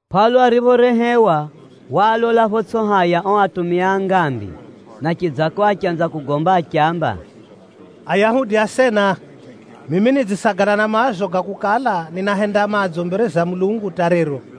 Pʼaulo ariphorehewa, waalola photsʼi haya o atumia a ngambi, na chidzako achanza kugomba achiamba, “Ayahudi asena, mimi nidzisagala na maazo ga kukala ninahenda madzo mbere za Mulungu hata rero.”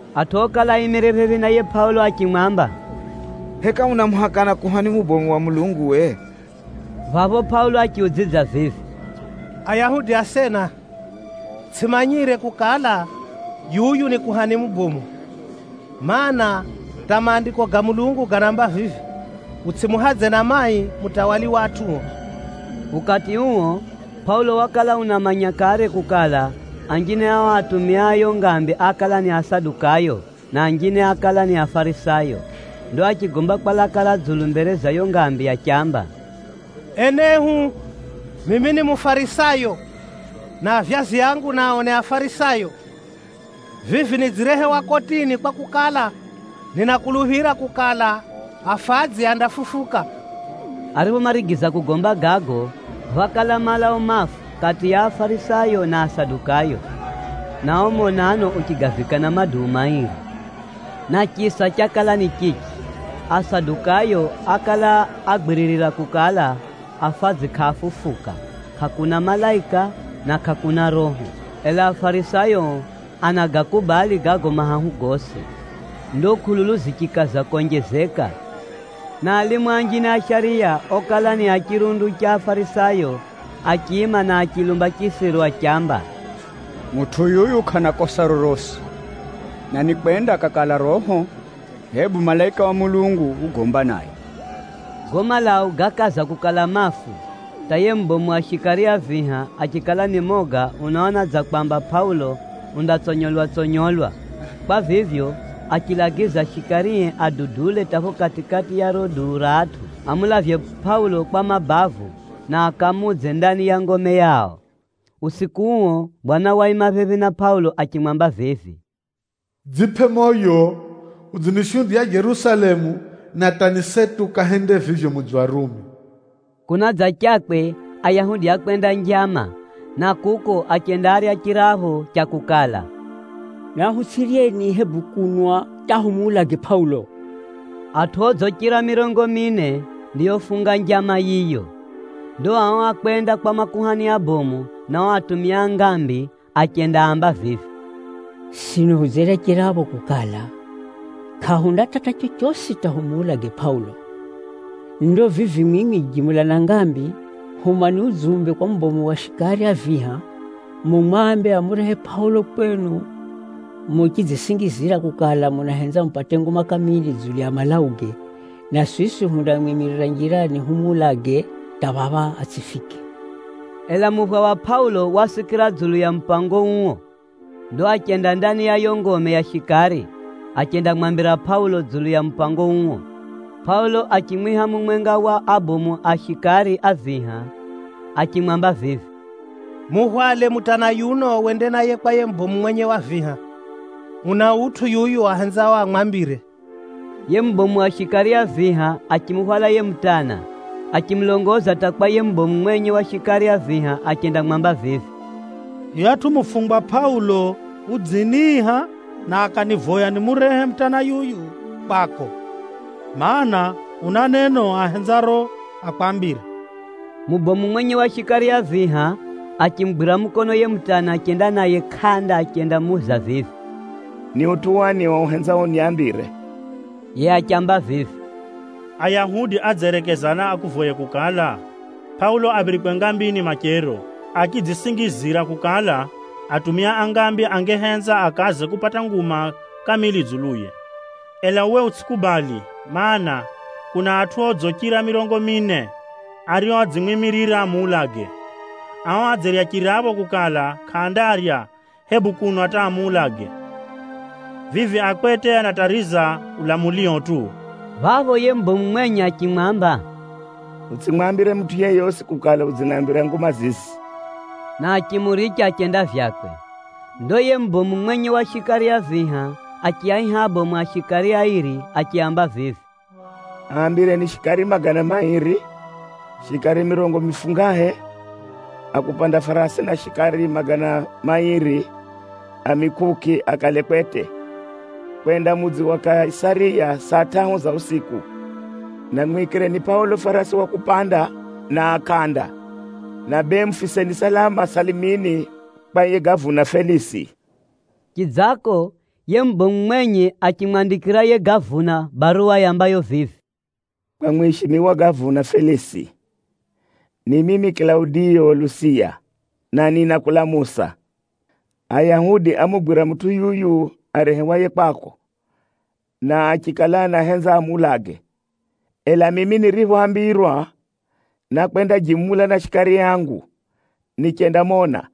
Atʼu okala aimire phephi na yiye Pʼaulo achimwamba, “Heka unamuhakana kuhani mubomu wa Mulungu we?” Phapho Pʼaulo achiudzidza vivi, “Ayahudi asena, tsʼimanyire kukala, yuyu ni kuhani mubomu. Maana, hata Maandiko ga Mulungu ganaamba vivi, ‘Utsʼimuhadze na mai mutawali wa atʼuo.’” Ukati uo, Pʼaulo wakala unamanya kare kukala, anjine a o atumia a yo ngambi ákala ni Asadukayo, na anjine ákala ni Afarisayo. Ndo achigomba kwa laka ra dzulu mbere za yo ngambi achiamba, “Enehu, mimi ni Mufarisayo, na avyazi angu nao ni Afarisayo. Vivi nidzirehewa kotini kwakukala, ninakuluphira kukala, afadzi andafufuka.” Ariphomarigiza kugomba gago, phákala malau mafu kati ya Afarisayo na Asadukayo, na o monano uchigavikana maduu mairi. (Na chisa chakala ni chichi, Asadukayo ákala agwiririra kukala, afadzi kʼaafufuka, kʼakuna malaika, na kʼakuna roho. Ela Afarisayo o anagakubali gago mahahu gosi.) Ndo kʼululu zichikaza konjezeka, na alimu anjine a shariya okala ni a chirundu cha Afarisayo, achiima na achilumba chisiru achiamba, “Mutʼu yuyu kʼana kosa rorosi. Na nikwenda akakala roho, hebu malaika wa Mulungu ugomba naye!” Gago malau gákaza kukala mafu, hata yiye mubomu wa shikari a viha achikala ni moga unaona dza kwamba Pʼaulo undatsonyolwa-tsonyolwa. Kwa vivyo, achilagiza shikarie adudule hata pho kati-kati ya riro duu ra atʼu, amulavye Pʼaulo kwa mabavu na akamuudze ndani ya ngome yao. Usiku uo, Bwana waima phephi na Pʼaulo achimwamba vivi, “Dzipʼe moyo! Udzinishuhudiya Jerusalemu, na hata ni seti ukahende vivyo mudzi wa Rumi.” Kunadzachakwe, Ayahudi ákwenda njama, na kuko achendaarya chirapho cha kukala, “Nahutsʼiryeni, hebu kunwa hata humuulage Pʼaulo.” Atʼu odzichira mirongo mine ndiofunga njama yiyo. Ndo ao ákwenda kwa makuhani abomu na o atumia a ngambi achendaamba vivi, “Sino hudzerya chirapho kukala, kʼahundatata chochosi hata humuulage Pʼaulo. Ndo vivi mwimwi jimula na ngambi, humani udzumbe kwa mubomu wa shikari a viha, mumwambe amurehe Pʼaulo kwenu muchidzisingizira kukala, munahenza mupate nguma kamili dzulu ya malauge. Na siswi hundamwimirira njirani humuulage hata phapha atsʼifike.” Ela muphwa wa Pʼaulo wasikira dzulu ya mupango uo. Ndo achenda ndani ya yo ngome ya shikari, achendamwambira Pʼaulo dzulu ya mupango uo. Pʼaulo achimwiha mumwenga wa abomu a shikari a viha achimwamba vivi, “Muhwale mutana yuno wende naye kwa yiye mubomu mwenye wa viha. Una utʼu yuyu ahenzao amwambire.” Yiye mubomu wa shikari a viha achimuhwala yiye mutana, achimulongoza hata kwa yiye mubomu mwenye wa shikari a viha achendamwamba vivi, “Yuyatʼu mufungwa Pʼaulo udziniiha na akanivoya nimurehe mutana yuyu kwako, mana, una neno ahenzaro akwambire.” Mubomu mwenye wa shikari a viha achimugwira mukono yiye mutana achenda naye kʼanda achendamuuza vivi, “Ni utʼu wani o uhenzao unambire?” Yiye achiamba vivi, “Ayahudi adzerekezana akuvoye kukala, Pʼaulo aphirikwe ngambini machero, achidzisingizira kukala, atumia a ngambi angehenza akaze kupata nguma kamili dzuluye. Ela uwe utsʼikubali, mana, kuna atʼu odzichira mirongo mine, ario adzimwimirira amuulage. Ao adzerya chirapho kukala, kʼaandarya, hebu kunwa hata amuulage. Vivi a kwete anatariza ulamulio tu!” Phapho yiye mubomu mwenye achimwamba, “Utsʼimwambire mutʼu yeyosi kukala udzinambira nguma zizi,” na achimuricha achenda vyakwe. Ndo yiye mubomu mwenye wa shikari a viha achiaiha abomu a shikari airi achiaamba vivi, “Aambireni shikari magana mairi, shikari mirongo mifungahe a kupanda farasi, na shikari magana mairi a mikʼukʼi akale kwete kwenda mudzi wa Kaisariya saa tʼahu za usiku. Na mwikireni Pʼaulo farasi wa kupanda na a kʼanda, na bee mufiseni salama salamini kwa yiye gavuna Felisi.” Chidzako, yiye mubomu mwenye achimwandikira yiye gavuna baruwa yambayo vivi: “Kwa mwishimiwa gavuna Felisi, ni mimi Kilaudiyo Lusiya, na ninakulamusa. Ayahudi ámugwira mutʼu yuyu arehewaye kwako, na achikala anahenza amuulage. Ela mimi niriphoambirwa, nákwenda jimula na shikari angu nichendamona,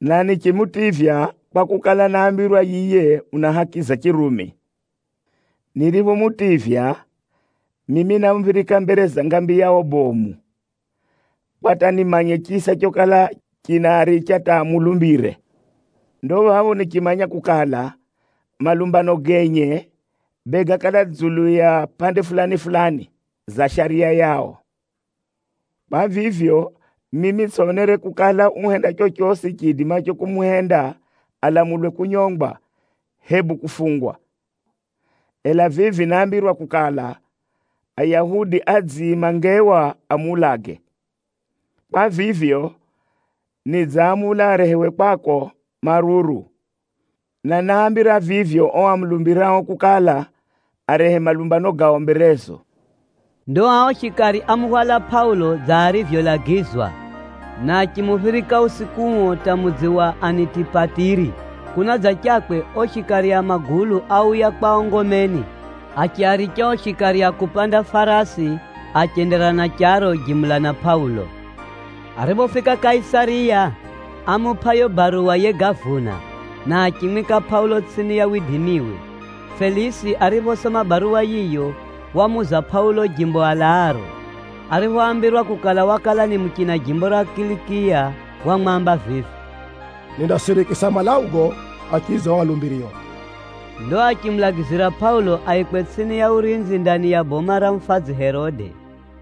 na nichimutivya kwakukala, náambirwa yiye una haki za Chirumi. Niriphomutivya, mimi námuphirika mbere za ngambi yao bomu, kwa hata nimanye chisa chokala chinaaricha hata amulumbire. Ndo phapho nichimanya kukala, malumbano genye, bee gákala ga dzulu ya pʼande fulani-fulani za shariya yao. Kwa vivyo, mimi tsʼonere kukala uhenda chochosi chiidimacho kumuhenda alamulwe kunyongwa, hebu kufungwa. Ela vivi náambirwa kukala, Ayahudi adziima ngewa amuulage. Kwa vivyo, nidzamula arehewe kwako maruru, na náambira vivyo o amulumbirao kukala, arehe malumbano gao mberezo.” Ndo ao shikari ámuhwala Pʼaulo dza arivyolagizwa, na achimuphirika usiku uo hata mudzi wa Anitipatiri. Kunadzachakwe, o shikari a magulu áuya kwao ngomeni, achiaricha o shikari a kupanda farasi achenderera na charo jimula na Pʼaulo. Ariphofika Kaisariya, ámupʼa yo baruwa yiye gavuna, na achimwika Pʼaulo tsʼini ya widimiwe. Felisi ariphosoma baruwa yiyo, wamuuza Pʼaulo jimbo alaaro. Ariphoambirwa kukala, wakala ni muchina jimbo ra Kilikiya, wamwamba vivi, “Nindasirikisa malaugo achidza o alumbirio.” Ndo achimulagizira Pʼaulo aikwe tsʼini ya urinzi ndani ya boma ra mufadzi Herode.